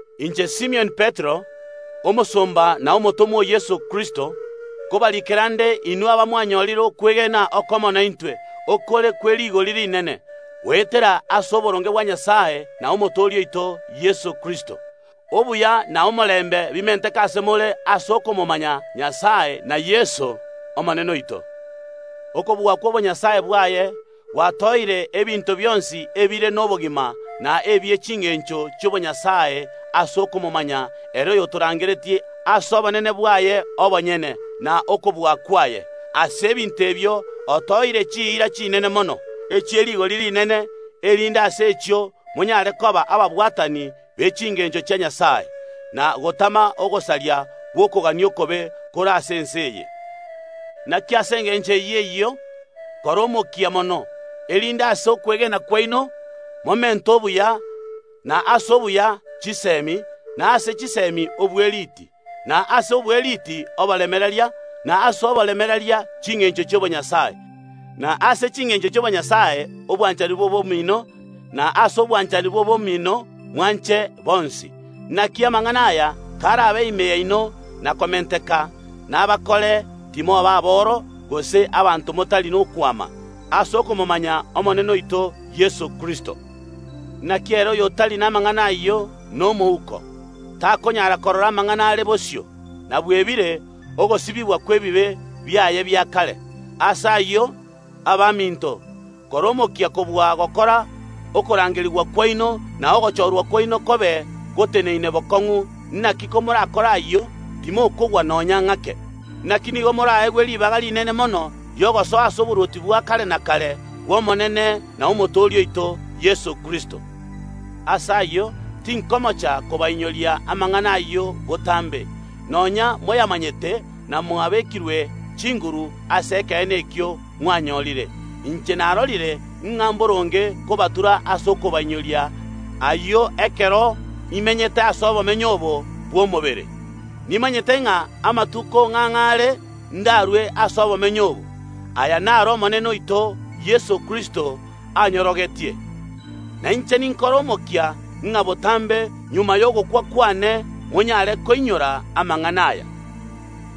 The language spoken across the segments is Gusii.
Korwa ase Simioni Petero, omosomba na omotomwa o Yeso Kristo, gocha ase baria abamwanyorire okwegena okomo naintwe, okore kwe rigori rinene, goetera ase oboronge bwa Nyasae na Omotooria oito Yeso Kristo. Obuya na omorembe bimenteke ase more ase okomomanya Nyasae na Yeso, Omonene oito. Okobua kw’obonyasae bwaye gwatoeire ebinto bionsi ebire nobogima na ebie chingencho chi’obonyasae ase okomomanya ere oyotorangeretie ase obonene bwaye obonyene, na okobua kwaye. Ase ebinto ebio otoeire chiira chinene mono, echie rigori rinene, erinde ase echio monyare koba ababwatani be chingencho chia Nyasae, na gotama ogosaria gw’okogania okobe kore ase ense eye. Naki ase engencho eyio eyio kora omokia mono, erinde ase okwegena kwaino momente obuya, na ase obuya chisemi, na ase chisemi obweriti, na ase obweriti oboremereria, na ase oboremereria chingencho chi’obonyasae, na ase chingencho chi’obonyasae obwanchani bw’obomino, na ase obwanchani bw’obomino mwanche bonsi. Naki amang’ana aya karabe ime yaino na komenteka, nabakore timoba aboro gose abanto motari nokwama, ase okomomanya Omonene oito Yeso Kristo. Naki ere oyotari namang’ana ayio nomouko, takonyara korora amang’ana are bosio, na bwebire ogosibigwa kw’ebibe biaye bia kare. Ase ayio, abaminto, kora omokia kobua gokora okorangerigwa kwaino na ogochorwa kwaino kobe goteneine bokong’u, naki komorakore ayio, timokogwa nonya ng’ake. Naki nigo moraegwe ribaga rinene mono ri’ogosoa ase oborwoti bwa kare na kare Omonene na Omotooria oito Yeso Kristo. Ase ayio, tinkomocha kobainyoria amang’ana ayio botambe, nonya moyamanyete na mwabekirwe chinguru ase ekeene ekio mwanyorire. Inche narorire ng’a mboronge kobatura ase okobainyoria ayio ekero imenyete ase obomenyo obo bw’omobere. Nimanyete ng’a amatuko ng’ang’e are ndarue ase obomenyo obo. Aya naro Omonene oito Yeso Kristo anyorogetie. Na inche ninkore omokia ng’a botambe magega y’ogokwa kwane monyare koinyora amang’ana aya.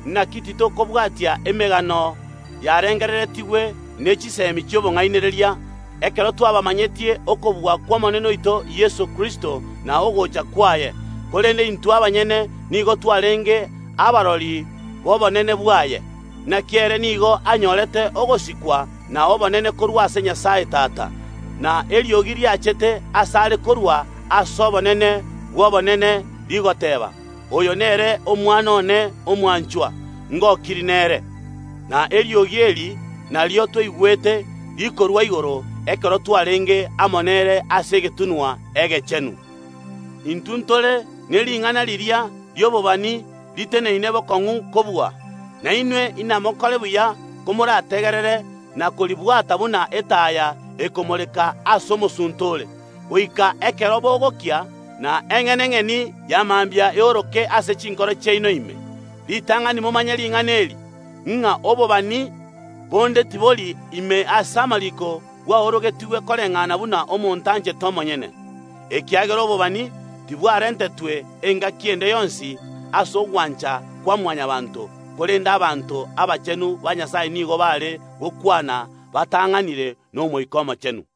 Naki titokobwatia emegano yarengereretigwe ne chisemi chi’obong’ainereria, ekero twabamanyetie okobua kw’Omonene oito Yeso Kristo na ogocha kwaye, korende intwe abanyene nigo twarenge abarori b’obonene bwaye. Naki ere nigo anyorete ogosikwa na obonene korwa ase Nyasae Tata, na eriogi riachete asare korwa ase obonene bw’Obonene, rigoteeba, “Oyo nere Omwana one omwanchwa, ngokirie nere.” Na eriogi eri nario twaigwete rikorwa igoro, ekero twarenge amo nere ase egetunwa egechenu. Intwe ntore ne ring’ana riria ri’obobani riteneine bokong’u kobua, na inwe inamokore buya komorategerere na koribwata buna etaya ekomoreka aase omosunte ore, goika ekero bogokia, na eng’enang’eni ya mambia eoroke ase chinkoro chiaino ime. Ritang’ani momanye ring’ana eri, ng’a obobani bonde tibori ime ase amariiko bwaorogetigwe koreng’ana buna omonto anchete omonyene, ekiagera obobani tibwarentetwe engaki ende yonsi ase ogwancha kwa Mwanyabaanto, korende abanto abachenu ba Nyasae nigo baare gokwana batang’anire n’Omoika Omochenu.